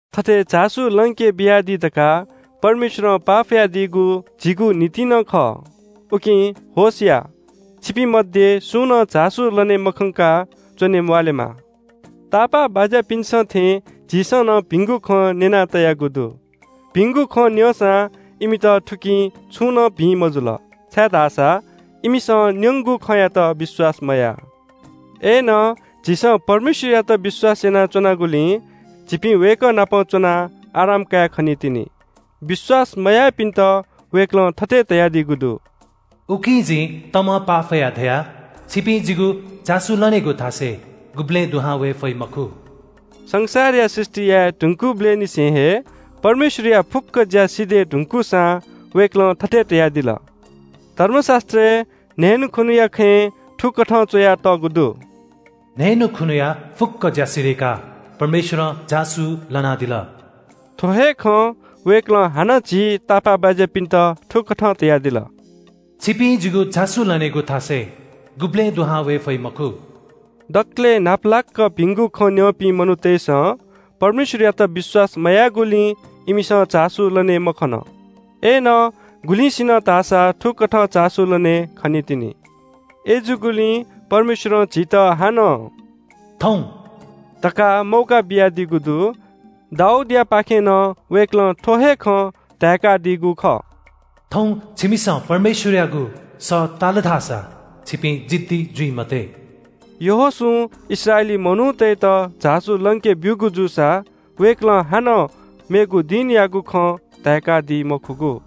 थथे झासु लंके बियादी धकाः परमेश्‍वरं पाफयादीगु झीगु निंतिं नं खः। उकिं होश या, छिपिं मध्‍ये सुं नं झासु लने मखंकाः च्‍वने म्‍वाःलेमा। तापाःबाज्‍यापिन्‍सं थें झीसं नं भिंगु खँ न्‍यना तयागु दु। भिंगु खँ न्‍यंसां इमित थुकिं छुं नं भिं मजुल, छाय्‌धाःसा इमिसं न्‍यंगु खँयात विश्‍वास मयाः। अय्‌नं झीसं परमेश्‍वरयात विश्‍वास यानाच्‍वनागुलिं झीपिं वय्‌कः नाप च्‍वनाः आराम काये खनीतिनि। विश्‍वास मयाःपिन्‍त वय्‌कलं थथे धयादीगु दु – “उकिं जिं तमं पाफयाः धया – ‘छिपिं जिगु झासु लनेगु थासय् गुबलें दुहां वये फइ मखु।’” संसारया सृष्‍टि याये धुंकूबलय् निसें हे परमेश्‍वरया फुक्‍क ज्‍या सिधय् धुंकूसां वय्‌कलं थथे धयादिल – धर्मशास्‍त्रय् न्‍हय्‌न्‍हुखुन्‍हुया खँय् थुकथं च्‍वयातःगु दु – “न्‍हय्‌न्‍हुखुन्‍हुया फुक्‍क ज्‍या सिधय्‌काः परमेश्‍वरं झासु लनादिल।” थ्‍व हे खँ वय्‌कलं हानं झी तापाःबाज्‍यापिन्‍त थुकथं धयादिल – “छिपिं जिगु झासु लनेगु थासय् गुबलें दुहां वये फइ मखु।” दकलय् न्‍हापालाक भिंगु खँ न्‍यंपिं मनूतय्‌सं परमेश्‍वरयात विश्‍वास मयाःगुलिं इमिसं झासु लने मखन। अय्‌नं गुलिसिनं धाःसा थुकथं झासु लने खनीतिनि। अय्‌जूगुलिं परमेश्‍वरं झीत हानं “थौं” धकाः मौका बियादीगु दु। दाऊदयापाखें नं वय्‌कलं थ्‍व हे खँ धाय्‌कादीगु खः – “थौं छिमिसं परमेश्‍वरयागु सः ताल धाःसा छिपिं जिद्दी जुइ मते।” यहोशूं इस्राएली मनूतय्‌त झासु लंके ब्‍यूगु जूसा वय्‌कलं हानं “मेगु दिनयागु” खँ धाय्‌कादी मखुगु।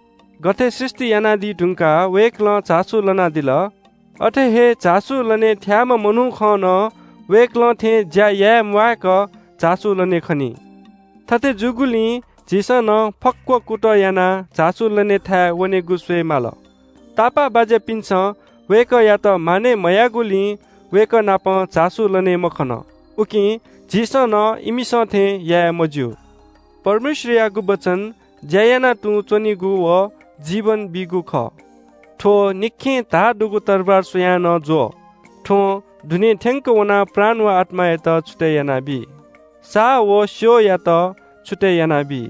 गथे सृष्‍टि यानादी धुंकाः वय्‌कलं झासु लनादिल, अथे हे झासु लने थ्‍याःम्‍ह मनुखं नं वय्‌कलं थें ज्‍या याये म्‍वायेक झासु लने खनी। थथे जूगुलिं झीसं नं फक्‍व कुतः यानाः झासु लने थाय् वनेगु स्‍वये माल। तापाःबाज्‍यापिन्‍सं वय्‌कःयात मानय् मयाःगुलिं वय्‌कः नाप झासु लने मखन, उकिं झीसं नं इमिसं थें याये मज्‍यू। छाय्‌धाःसा परमेश्‍वरयागु वचन ज्‍या याना तुं च्‍वनीगु व जीवन बीगु खः। थ्‍व निखें धाः दुगु तरवार स्‍वयाः नं ज्‍वः, थ्‍वं दुने थ्‍यंक वनाः प्राण व आत्‍मायात छुतय् यानाबी, साहाः व स्‍यःयात छुतय् यानाबी।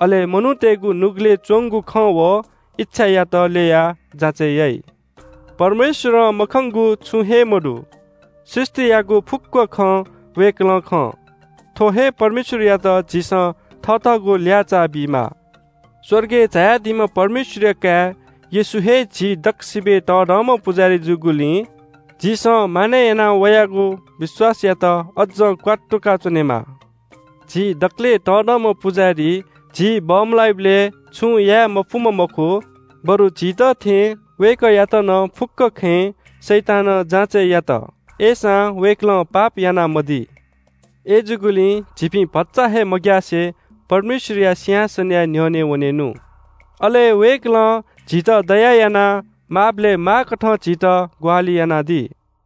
अले मनूतय्‌गु नुगलय् च्‍वंगु खँ व इच्‍छायात ल्‍ययाः जाँचय् याइ। परमेश्‍वरं मखंगु छुं हे मदु। सृष्‍टियागु फुक्‍क खँ वय्‌कलं खं। थ्‍व हे परमेश्‍वरयात झीसं थथःगु ल्‍याःचाः बीमाः। स्‍वर्गय् झायादीम्‍ह परमेश्‍वरया काय् येशू हे झी दक्‍वसिबय् तःधंम्‍ह पुजाहारी जूगुलिं झीसं मानय् यानाः वयागु विश्‍वासयात अज्‍जं क्‍वात्तुकाच्‍वनेमाः। झी दकलय् तःधंम्‍ह पुजाहारी झी बमलाइबलय् छुं याये मफुम्‍ह मखु, बरु झीत थें वय्‌कःयात नं फुक्‍क खँय् शैतानं जाँचय् यात, अय्‌सां वय्‌कलं पाप यानामदी। अय्‌जूगुलिं झीपिं भचा हे मग्‍यासे परमेश्‍वरया सिंहासनया न्‍ह्यःने वनेनु। अले वय्‌कलं झीत दया यानाः माःबलय् माःकथं झीत ग्‍वाहालि यानादी।